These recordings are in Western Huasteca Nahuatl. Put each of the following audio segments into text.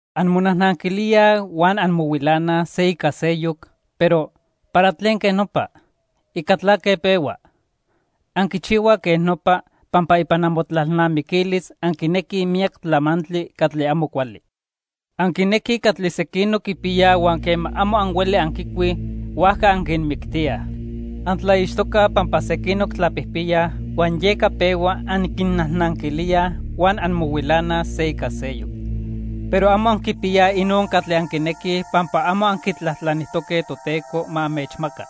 Anmonajnanquilíaj huan anmohuilanaj se ica seyoc, pero ¿para tlen quej nopa? ¿Ica tlaque pehua? Anquichihuaj quej nopa, pampa ipan amotlalnamiquilis anquinequij miyac tlamantli catli amo cuali. Anquinequij catli sequinoc quipiyaj huan quema amo anhuelij anquicuij, huajca anquinmictíaj. Antlaixtocaj pampa sequinoc tlapijpiyaj huan yeca pehua anquinnajnanquilíaj huan anmohuilanaj se ica seyoc. Pero amo anquipiyaj inon catli anquinequij pampa amo anquitlajtlanijtoque Toteco ma anmechmaca.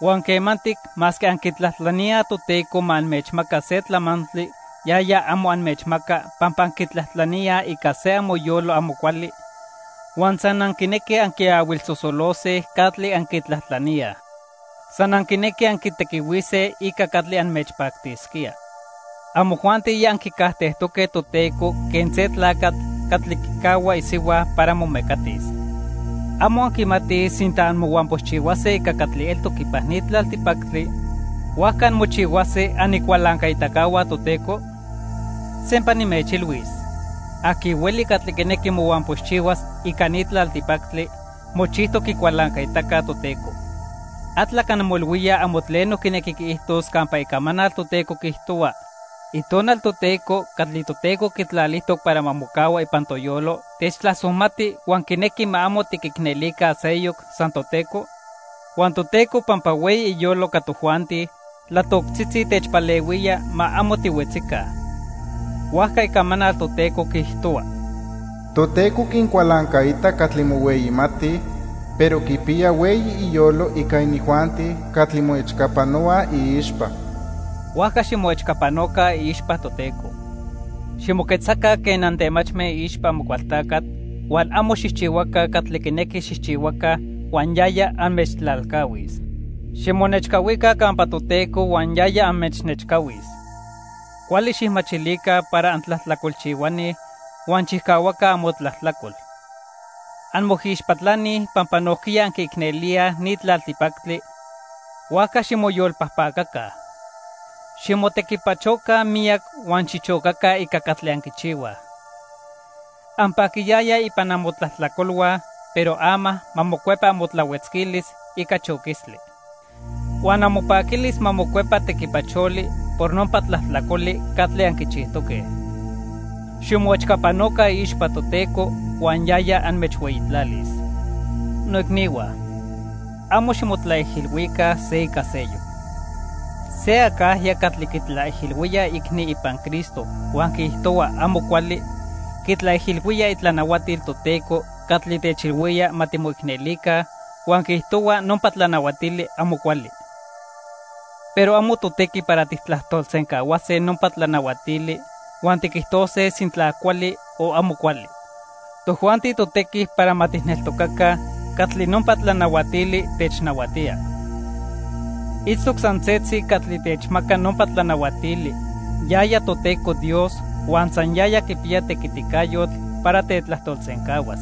Huan quemantic, masque anquitlajtlaníaj Toteco ma anmechmaca se tlamantli, yaya amo anmechmaca pampa anquitlajtlaníaj ica se amoyolo amo cuali, huan san anquinequij anquiahuilsosolose catli anquitlajtlaníaj. San anquinequij anquitequihuise ica catli anmechpactisquía. Amojuanti ya anquicajtejtoque Toteco quen se tlacatl catli quicahua isihua para momecatis. ¿Amo anquimatij, sintla anmohuampoxchihuase ica catli eltoc ipan ni tlaltipactli, huajca anmochihuase anicualancaitacahua Toteco? Sempa nimechilhuis, aqui hueli catli quinequi mohuampoxchihuas ica ni tlaltipactli, mochijtoc icualancaitaca Toteco. ¿Atlac anmoilhuíaj amo tleno quinequi quiijtos campa Icamanal Toteco quiijtohua: "Itonal Toteco catli Toteco quitlalijtoc para ma mocahua ipan toyolo techtlasomati huan quinequi ma amo tiquicnelica seyoc, san Toteco"? Huan Toteco pampa hueyi iyolo ica tojuanti, tlatoctzitzi techpalehuía ma amo tihuetzica. Huajca Icamanal Toteco quiijtohua: "Toteco quincualancaita catli mohueyimatij, pero quipiya hueyi iyolo ica inijuanti catli moechcapanohuaj iixpa." Huajca ximoechcapanoca iixpa Toteco. Ximoquetzaca quen antemachme iixpa Amocualtlacatl huan amo xijchihuaca catli quinequi xijchihuaca, huan yaya anmechtlalcahuis. Ximonechcahuica campa Toteco huan yaya anmechnechcahuis. Cuali xijmachilica para antlajtlacolchihuani huan xijcahuaca amotlajtlacol. Anmoijixpatlani pampa nojquiya anquiicnelíaj ni tlaltipactli, huajca ximoyolpajpacaca. Ximotequipachoca miyac huan xichocaca ica catli anquichihuaj. Anpaquiyayaj ipan amotlajtlacolhua, pero ama ma mocuepa amotlahuetzquilis ica choquistli. Huan amopaquilis ma mocuepa tequipacholi por nopa tlajtlacoli catli anquichijtoque. Ximoechcapanoca iixpa Toteco huan yaya anmechhueyitlalis. Noicnihua, amo ximotlaijilhuica se ica seyoc. Se acajya catli quitlaijilhuía iicni ipan Cristo huan quiijtohua amo cuali, quitlaijilhuía itlanahuatil Toteco catli techilhuía ma timoicnelica, huan quiijtohua nopa tlanahuatili amo cuali. Pero amo totequi para tijtlajtolsencahuase nopa tlanahuatili, huan tiquijtose sintla cuali o amo cuali. Tojuanti totequi para ma tijneltocaca catli nopa tlanahuatili technahuatía. Itztoc san setzi catli techmaca nopa tlanahuatili, yaya Toteco Dios, huan san yaya quipiya tequiticayotl para tetlajtolsencahuas.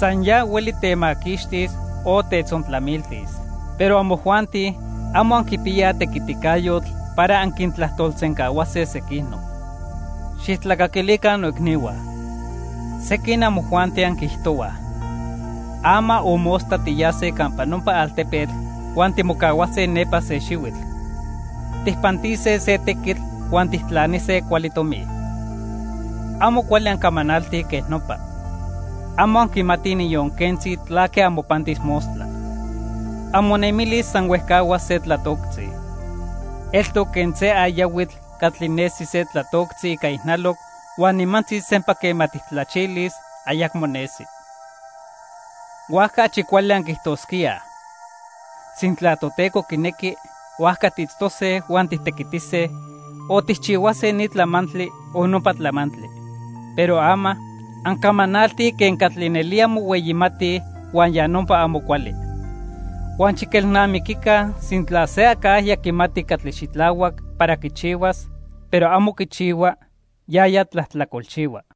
San ya hueli temaquixtis o tetzontlamiltis. Pero amojuanti, amo anquipiyaj tequiticayotl para anquintlajtolsencahuase sequinoc. Xijtlacaquilica noicnihua. Sequin amojuanti anquiijtohuaj: "Ama o mostla tiyase campa nopa altepetl huan timocahuase nepa se xihuitl. Tijpantise se tequitl huan tijtlanise cuali tomi." Amo cuali ancamanaltij quej nopa. Amo anquimatij niyon quentzi tlaque amopantis mostla. Amonemilis san huejcahuas se tlatoctzi. Eltoc quen se ayahuitl catli nesi se tlatoctzi ica ijnaloc huan nimantzi sempa quema tijtlachilis, ayacmo nesi. Huajca achi cuali anquiijtosquíaj: "Sintla Toteco quinequi, huajca tiitztose huan titequitise, o tijchihuase ni tlamantli o nopa tlamantli." Pero ama, ancamanaltij quen catli nelía mohueyimatij, huan ya nopa amo cuali. Huan xiquelnamiquica, sintla se acajya quimati catli xitlahuac para quichihuas, pero amo quichihua, yaya tlajtlacolchihua.